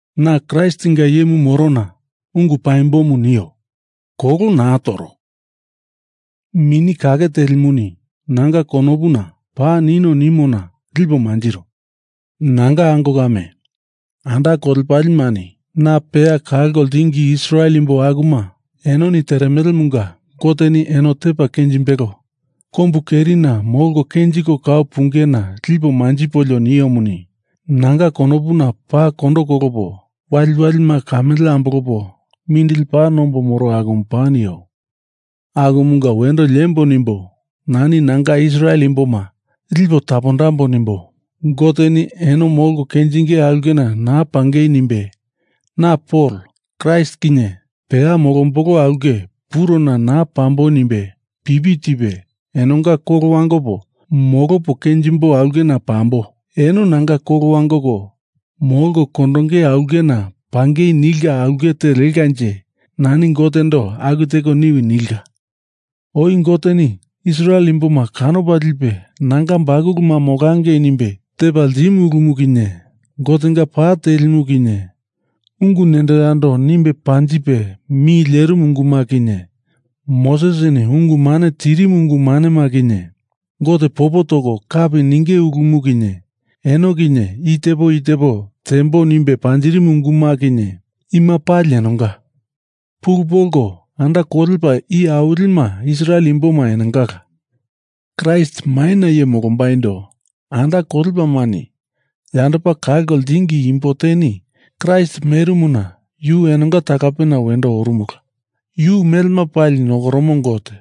Na Kraistinga iyemu moro na ungu paimbomu nio. Kolo naa toro. Mini Kake Telimuni nanga konopuna paa nino nimona lipo manjiro. Nanga ango kame, anda kolepalemani na peya kalko ltingi Israel imbo akuma, enoni teremelemunga Goteni eno tepa kenjimbelo, kombu kerina molko kenjiko kau punge na lipo manjipolio niomuni, nanga konopuna paa kondo kolopo waliwalima kamele ambolopo mindili paa nombo moro akumu paa nio. Akumunga wendo liembo nimbo nani nanga Israel imboma lipo tapondambo nimbo Goteni eno molko kenjinge aulkena naa pangei nimbe na Pol Kraist kinye peya molombolo aulke purona naa pambo nimbe pipi tipe, enonga kolo wangopo molopo kenjimbo aulkena pambo, eno nanga kolo wangoko molko kondonge aulkena pangei nilka aulke te lekanje nani Gotendo aku teko niwi nilka. Oi Goteni Israel imboma kanopa lipe nanga bakuluma molangei nimbe tepa ltimu ulumu kinye Gotenga pa telimu kinye, ungu nendo yando nimbe panjipe mi lierimu unguma kinye, Mosesini ungu mane tirimu ungu manema kinye, Gote popo toko kapi ninge ulumu kinye, eno kinye i tepo i tepo tembo nimbe panjirimu unguma kinye, ima pali enonga. Pulu polko anda kolepa iye awilima Israel imboma enongala. Kraist maina iye molombaindo anda kolepalemani yandopa kalko ltingi imbo teni Kraist merimuna yu enonga talapena wendo orumula. Yu melema pali nokoromo Gote.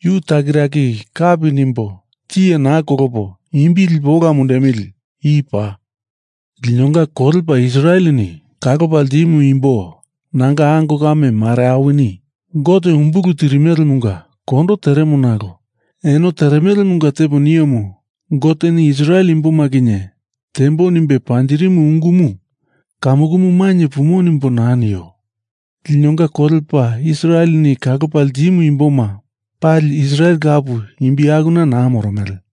Yu takiraki kapi nimbo tiye naa kolopo imbi lipo ola mundemili. I paa. Linonga kolepa Israeleni kalopa ltimu imbo nanga ango kame mare awini Gote umbulu tirimelemunga kondo teremo nalo eno teremelemunga tepo niomu Goteni Israel imboma kinye tembo nimbe panjirimu ungumu kamukumu mainye pumo nimbo naa nio. Linonga kolepa Israeleni kalopa ltimu imboma pali Israel lapu imbi akuna naa moromele.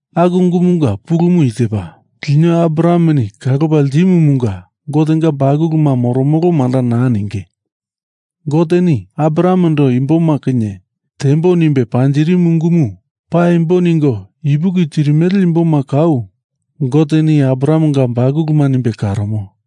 Aku ungumunga pulumu i tepa: Lino Abrahameni kalopa ltimumunga Gotenga bakuluma moromolo manda naa ninge. Goteni Abrahamendo imboma kinye tembo nimbe panjirimu ungumu paimbo ningo ipuki tirimele imboma kau Goteni Abrahamenga bakuluma nimbe karomo.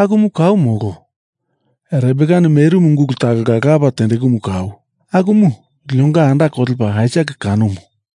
Akumu kau molo. Rebekani merimu ungulu talonga lapa tendekumu kau, akumu linonga anda kolepa Aisak kanomu.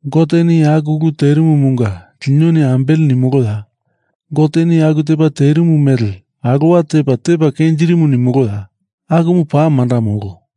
Goteni aku ulu terimumunga linoni ambele nimoloya? Goteni aku tepa terimu mele alowa tepa, tepa kenjirimu nimoloya? Akumu paa manda molo.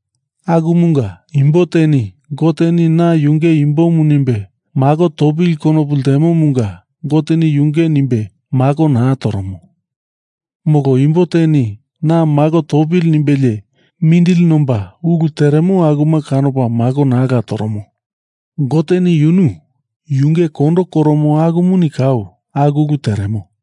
Akumunga imbo teni Goteni na yunge imbomu nimbe mako topili konopu ltemomunga Goteni yunge nimbe mako naa toromo. Molo imbo teni Na mako topili nimbelie mindili nomba ulu teremo akuma kanopa mako naala toromo. Goteni yunu, yunge kondo koromo akumuni kau aku ulu teremo.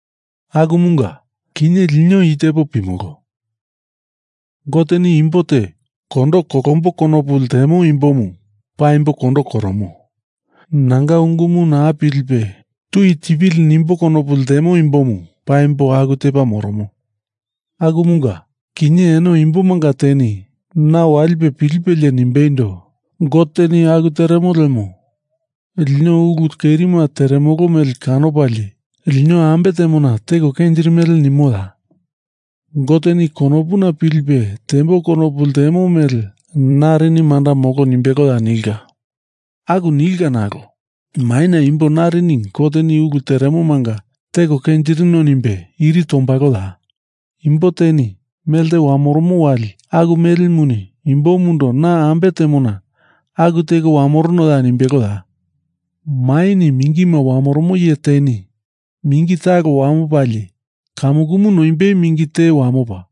Akumunga, kinye lino i tepo pimolo. Goteni Imbo te kondo kolombo konopu lemo imbomu paimbo kondo koromo. Nanga ungumu naa pilipe tui tipili nimbo konopu lemo imbomu paimbo aku tepa moromo. Akumunga kinye eno imbomanga teni na walipe pilipelie nimbeindo, Goteni aku teremo lemo lino ulu kerima teremolo mele kanopalie lino ambe temona teko kenjirimele nimoya? Goteni konopuna pilipe tembo konopu lemo mele narini manda molo nimbeloya nilka. Aku nilkala nalo maina imbo narini Goteni ulu teremomanga teko kenjirino nimbe iri tombaloya? Imbo teni melte wamoromo wali aku melemuni imbomundo na ambe temona aku teko wamoronoya nimbeloya? Maini mingima wamoromo iye teni mingi talo wamopalie kamukumu noimbei mingi te wamopa,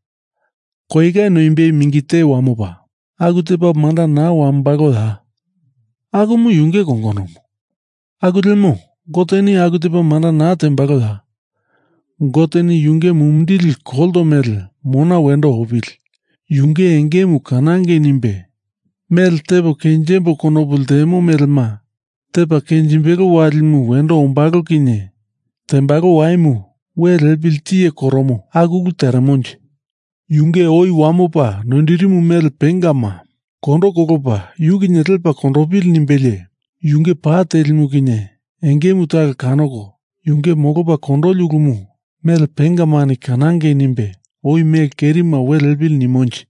koieka noimbei mingi te wamopa aku tepa manda naa wamombaloya? Akumu yunge kongonomu. Aku lemo Goteni aku tepa manda naa tembaloya? Goteni Yunge mumindili kolto mele mona wendo opili, yunge engemu kanangei nimbe, mele tepo kenjimbo konopu lemo melema tepa kenjimbelo walimu wendo ombalo kinye tembalo waimu we liepili tiye koromo aku ulu teremonje? Yunge oi wamopa noindirimu mele pengama kondo kolopa yu kinye lepa kondopili nimbelie yunge pa telimu kinye engemu talo kanoko, yunge molopa kondoli ulumu mele pengamani kanangei nimbe oi mele kerima we liepili nimonje.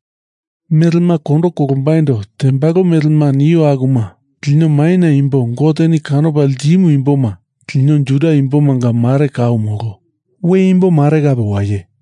Melema kondo kolombaindo tembalo melema nio akuma lino maina imbo Goteni kanopa ltimu imboma. Lino Juda imbomanga mare kau molo. We imbo mare kape waye.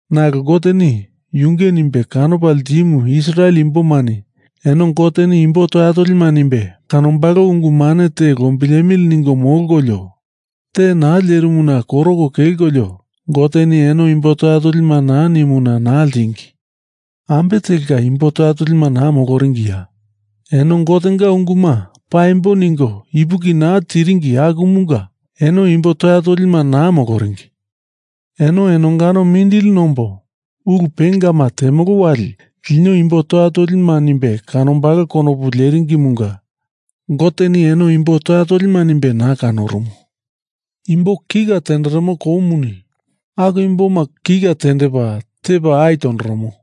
Nalo Goteni yunge nimbe kanopa ltimu Israel imbomani eno Goteni imbo toya tolima nimbe kanombalo ungu mane te lombilemili ningo molkolio te naa lierimuna koroko kelkolio Goteni eno imbo toya tolima naa nimuna naa ltingi. Ambe telka imbo toya tolima naa moloringiya? Eno Gotenga unguma paimbo ningo ipuki naa tiringi akumunga eno imbo toya tolima naa moloringi. Eno enongano mindili nombo ulu pengama temolo wali lino imbo toya tolima nimbe kanombalo konopu leringimunga Goteni eno imbo toya tolima nimbe naa kanorumu. Imbo kika tenderemo koumuni aku imboma kika tendepa tepa ai tondoromo.